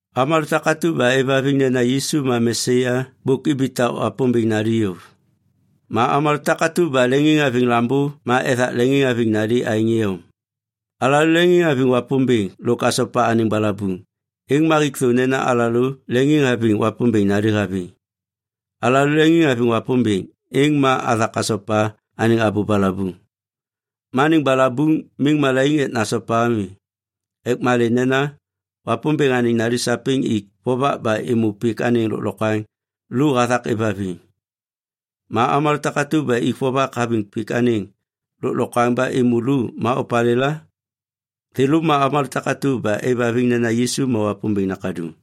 Avômalô takatu ba êvhaviŋ nena Yisu ma Mesaya bôk ibitak Wapômbêŋ nali yôv. Ma avômalô takatu ba leŋiŋhaviŋ Lambô ma ethak leŋiŋhaviŋ anêŋ nali aêŋ iyom. Alalô leŋiŋhaviŋ Wapômbêŋ lôk asopa anêŋ balabuŋ, êŋ ma hik thô nena alalô leŋiŋhaviŋ Wapômbêŋ nali haviŋ. Alalô leŋiŋhaviŋ Wapômbêŋ, êŋ ma athak asopa anêŋ abô balabuŋ. Ma anêŋ balabuŋ miŋ malaiŋ ek nasopa ami ek malê nena Wapômbêŋ anêŋ nali sapêŋ ik vovak ba êmô pik anêŋ lôklokwaŋ lu hathak êvhaviŋ. Ma avômalô takatu ba ik vovak haviŋ pik anêŋ lôklokwaŋ ba êmô lu ma opalêla? Thêlô ma avômalô takatu ba êvhaviŋ nena Yisu ma Wapômbêŋ Nakaduŋ.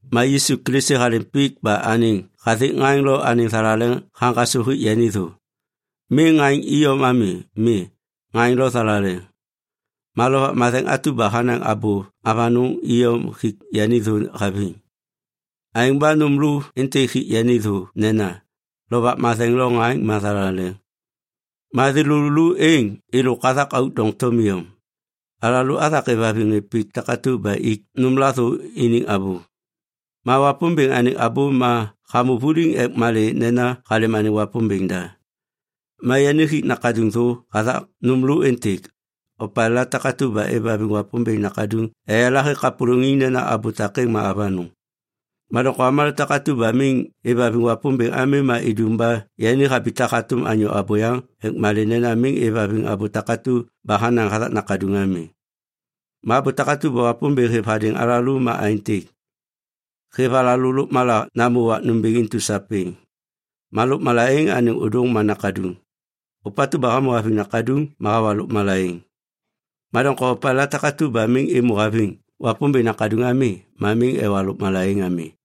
Ma Yisu Kilisi halêm pik ba anêŋ hathik ŋaŋ lo anêŋ thalaleŋ haŋgasô hik yani thô. Miŋ ŋaŋ iyom ami. Mi, ŋaŋ lo thalaleŋ. Ma Lovak Matheŋ atu ba hanaŋ abô avanôŋ iyom hik yani thô haviŋ. Aêŋ ba intu nôm lokwaŋlô hik yani thô aêntêk, Lovak Matheŋ lo ŋaŋ ma thalaleŋ. Ma thêlô lô êŋ êlôk hathak auk doŋtom iyom. Alalô athak êvhaviŋ ŋê pik takatu ba ik nômla thô iniŋ abô. Ma Wapômbêŋ anêŋ abô ma hamô vuliŋ ek malê nena halêm anêŋ Wapômbêŋ da. Ma yani hik Nakaduŋ thô hathak nôm lô êntêk. Opalêla takatu ba êvhaviŋ Wapômbêŋ Nakaduŋ eyala hêk kapôlôŋiŋ nena abô takêŋ ma avanôŋ. Ma doŋtom avômalô takatu ba miŋ êvhaviŋ Wapômbêŋ ami ma idum ba yani habitak hatôm anyô abôyaŋ ek malê nena miŋ êvhaviŋ abô takatu ba hanaŋ hathak Nakaduŋ ami. Ma abô takatu ba Wapômbêŋ hêv hadêŋ alalô ma aêntêk. Hêv alalô lôkmala namô wak nômbêŋ intu sapêŋ. Ma lôkmala êŋ anêŋ ôdôŋ ma Nakaduŋ. Ôpatu ba hamô haviŋ Nakaduŋ ma hawa lôkmala êŋ. Ma doŋtom opalêla takatu ba miŋ êmô haviŋ Wapômbêŋ Nakaduŋ ami ma miŋ ewa lôkmala êŋ ami.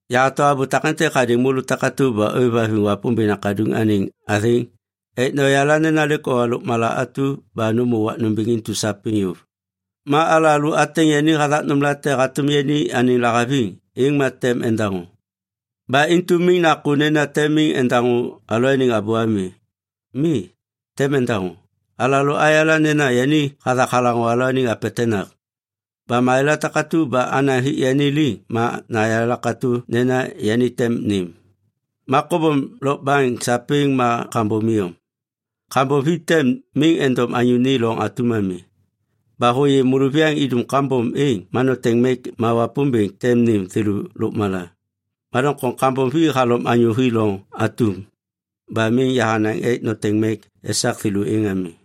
Yahato abô takêntêk hadêŋ môlô takatu ba ôêvhaviŋ Wapômbêŋ Nakaduŋ anêŋ athêŋ ek noyala nena lêk owa lôkmala atu ba nômô wak nômbêŋ intu sapêŋ yôv. Ma alalô ateŋ yani hathak nômlate hatôm yani anêŋ lahaviŋ, êŋ ma tem endaŋô. Ba intu miŋ nakô nena tem miŋ endaŋô alalôaniŋ abô ami. Mi, tem endaŋô. Alalô ayala nena yani hathak halaŋô alalôaniŋ apetenak. Ba malêla takatu ba anaŋ hik yani liŋ ma nayala katô nena yani tem nêm. Ma kobom lokbaŋ sapêŋ ma kambom iyom. Kambom vi tem miŋ endom anyô ni loŋ atum ami. Ba hôyê môlôviyaŋ idum kambom êŋ, ma noteŋ mek ma Wapômbêŋ tem nêm thêlô lôkmala. Ma doŋtom kambom vi halom anyô hi loŋ atum ba miŋ yahanaŋ ek noteŋ mek esak thêlô êŋ ami.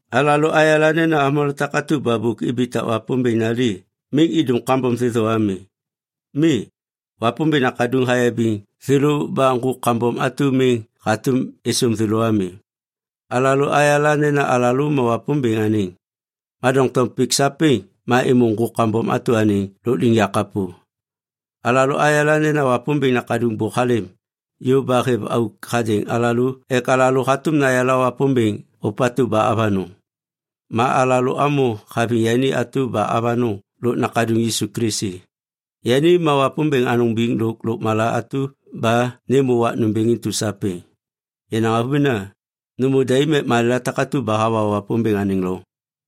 Alalô ayala nena avômalô takatu ba bôk ibitak Wapômbêŋ nali miŋ idum kambom thêthô ami. Mi, Wapômbêŋ Nakaduŋ hayabiŋ thêlô ba ŋgôk kambom atu miŋ hatôm êsôm thêlô ami. Alalô ayala nena alalô ma Wapômbêŋ anêŋ, ma doŋtom pik sapêŋ ma êmô ŋgôk kambom atu anêŋ lôkliŋyak kapô. Alalô ayala nena Wapômbêŋ Nakaduŋ bôk halêm yôv ba hêv auk hadêŋ alalô ek alalô hatôm nayala Wapômbêŋ ôpatu ba avanôŋ. Ma alalô amô haviŋ yani atu ba avanôŋ lôk Nakaduŋ Yisu Kilisi. Yani ma Wapômbêŋ anôŋ biŋ lôk lôkmala atu ba nêmô wak nômbêŋ intu sapêŋ. Yenaŋ avômena, nômô daim ek malêla takatu ba hawa Wapômbêŋ anêŋ loŋ.